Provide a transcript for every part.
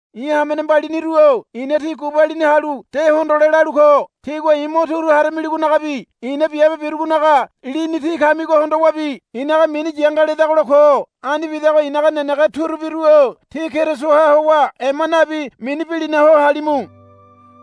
I̱ hamene mbaliniru-o i̱na tí gubalini halu de hondole lalu ko. Tígua i̱ mo turu haramiligonagabi i̱na biabe birugonaga lini tí kamigo hondowabi i̱naga mini yanga ledagola ko. Ani bidago i̱naga nenege turubiru-o tí Kerisoha howa ema nabi mini bilina ho halimu.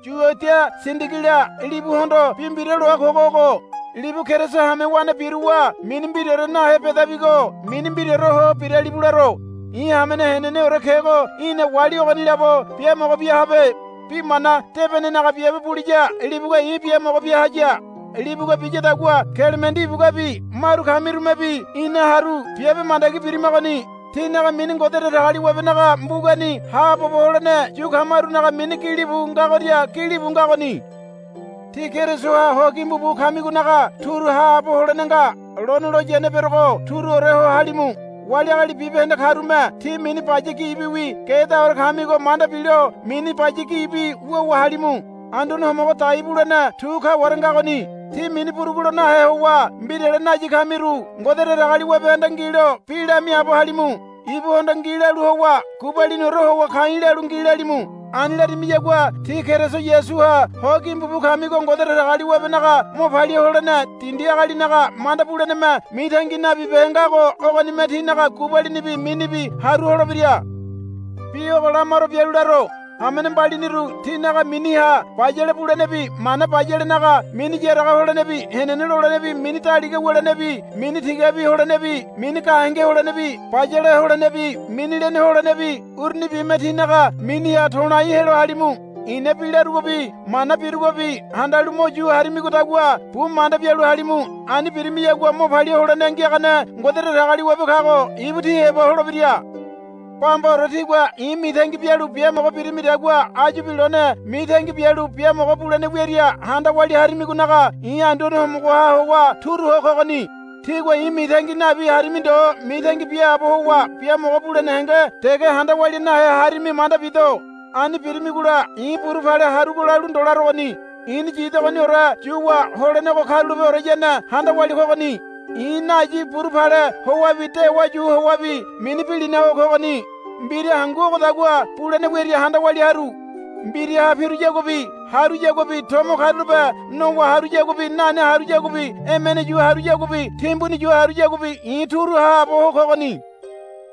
Yuodia Sindigila libuhondo bi mbira loa kogo ogo. Libu Keriso hamewane biruwa mini mbiraore nahe bedabigo mini mbiraore ho biralibu laro. I̱ hamene heneneore kego í̠na wali ogoni labo biamogo bia habe. Bi mana debenenaga biabe buliya libugua i̱ biamogo bia haya. Libugua biyadagua Kelemendi ibuguabi maru kamirumebi ina haru biabe mandagi birimagoni. Tinaga mini Ngode Datagaliwabenaga mbugani haabobo holene yu kamarunaga mini bilibu ngagoria bilibu ngagoni. Tí Kerisoha ho gimbu bu kamigonaga turu haabo holene nga. Lone loyane berogo turuore ho halimu. Wali agali bibahende karume ti mini baya gibiwi gedaore kamigo manda bilo mini baya gibi wuwa halimu. Anduane Homogo dai bulene tu kaware ngagoni. Tí mini burugu lo nahe howa mbirale nayi kamiru Ngode Datagaliwabehanda ngilo bi lamiaabo halimu. Ibuhondo ngi lalu howa gubaliniore howa ka̱i̱ lalu ngi lalimu. Ani larimiyagua tí Keriso Yasuha ho gimbu bu kamigo Ngode Datagaliwabenaga mo palia holene dindi agalinaga manda buleneme mitangi nabibehe ngago ogonime tínaga gubalinibi minibi haru holebira. Bi ogo lamaro bialu laro. Hamene mbaliniru tínaga miniha bayale bulenebi mana bayalenaga mini yaraga holenebi henene lolenebi mini daliga wulenebi mini tigabi holenebi mini gahenge holenebi bayale holenebi mini lene holenebi urunibime tínaga miniha to̱lai helo halimu. I̱na bi larugobi mana birugobi handalu mo yu harimigodagua bu manda bialu halimu. Ani birimiyagua mo palia holene ngiagane Ngode Datagaliwabe kago ibu tí heba holebira. Bambaore tígua i̱ mitangi bialu biamogo birimidagua áyubi lone mitangi bialu biamogo bulene wiaria handa walia harimigonaga i̱ Anduane Homogoha howa turu ho kogoni. Tígua i̱ mitangi nabi harimi ndo mitangi biaabo howa biamogo bulene henge dege handa walia nahe harimi manda bido. Ani birimigola i̱ buru pale harugo lalu ndo larogoni. I̱ni yidogoniore yuwa holenego karulapeoreyane handa walia kogoni. I̱ nayi buru pale howabi dewa yu howabi mini bilina ho kogoni. Mbira hangu ogodagua bulene wiaria handa walia haru. Mbiraha piruyaguabi haruyaguabi tomo karulape nowa haruyaguabi nane haruyaguabi emene yu haruyaguabi timbuni yu haruyaguabi i̱ turu haabo ho kogoni.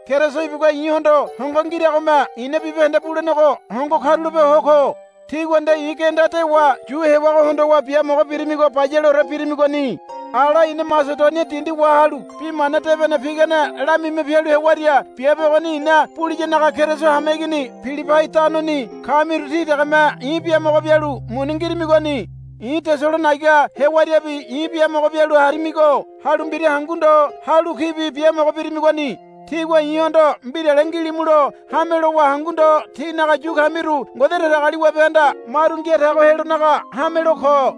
Keriso ibugua i̱hondo hongo ngiragome i̱na bibahende bulenego hongo karulape ho ko. Tígua nde i̱ genda dewa yu hewago hondowa biamogo birimigo bayaleore birimigoni. Ala i̱na Masedonia dindi wahalu Bi Mana Debene pigane lamima pialu hewaria biabe ogoni i̱na buliyanaga Keriso hameigini Pilibai tanoni kamiru tí degeme i̱ biamogo bialu muni ngirimigoni. I̱ Tesalonaiga hewariabi i̱ biamogo bialu harimigo halu mbira hangu ndo halu kibi biamogo birimigoni. Tígua i̱hondo mbirale ngilimulo hame lowa hangu ndo tínaga yu kamiru Ngode Datagaliwabehanda maru ngia tago helonaga hamelo ko.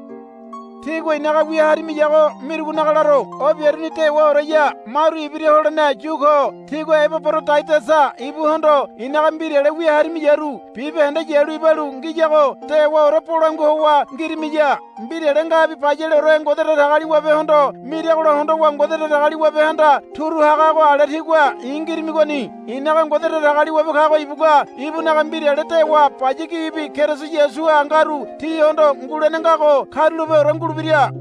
Tígua i̱naga wia harimiyago mirugonaga laro. O biaruni dewaoreya maru ibira holene yu ko. Tígua Ebaborodaidasa ibuhondo i̱naga mbirale wia harimiyaru bibahende yalu ibalu ngiyago dewaore bolangua howa ngirimiya. Mbirale ngabi bayaleore Ngode Datagaliwabehondo miragola hondowa Ngode Datagaliwabehanda turu hagago ale tígua i̱ ngirimigoni. I̱naga Ngode Datagaliwabe kago ibugua ibunaga mbirale dewa baya gibi Keriso Yasuha ngaru tíhondo ngulene ngago karulapeore ngulebira.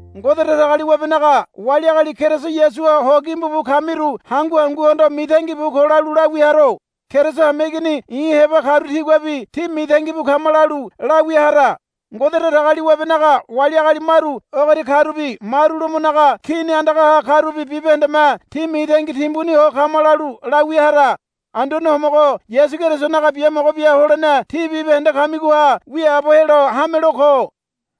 Ngode Datagaliwabenaga wali agali Keriso Yasuha ho gimbu bu kamiru hangu hanguhondo mitangi bu ko lalu lawia haro. Keriso hameigini i̱ heba karu tiguabi, Tí mitangi bu kama, lalu lawia hara. Ngode Datagaliwabenaga wali agali maru ogoria karubi maru Lomonaga Kini andagaha karubi bibahendeme, Tí mitangi timbuni ho kama, lalu lawia hara. Anduane Homogo Yasu Kerisonaga biamogo bia holene tí bibahende kamigoha wiaabo helo hamelo ko.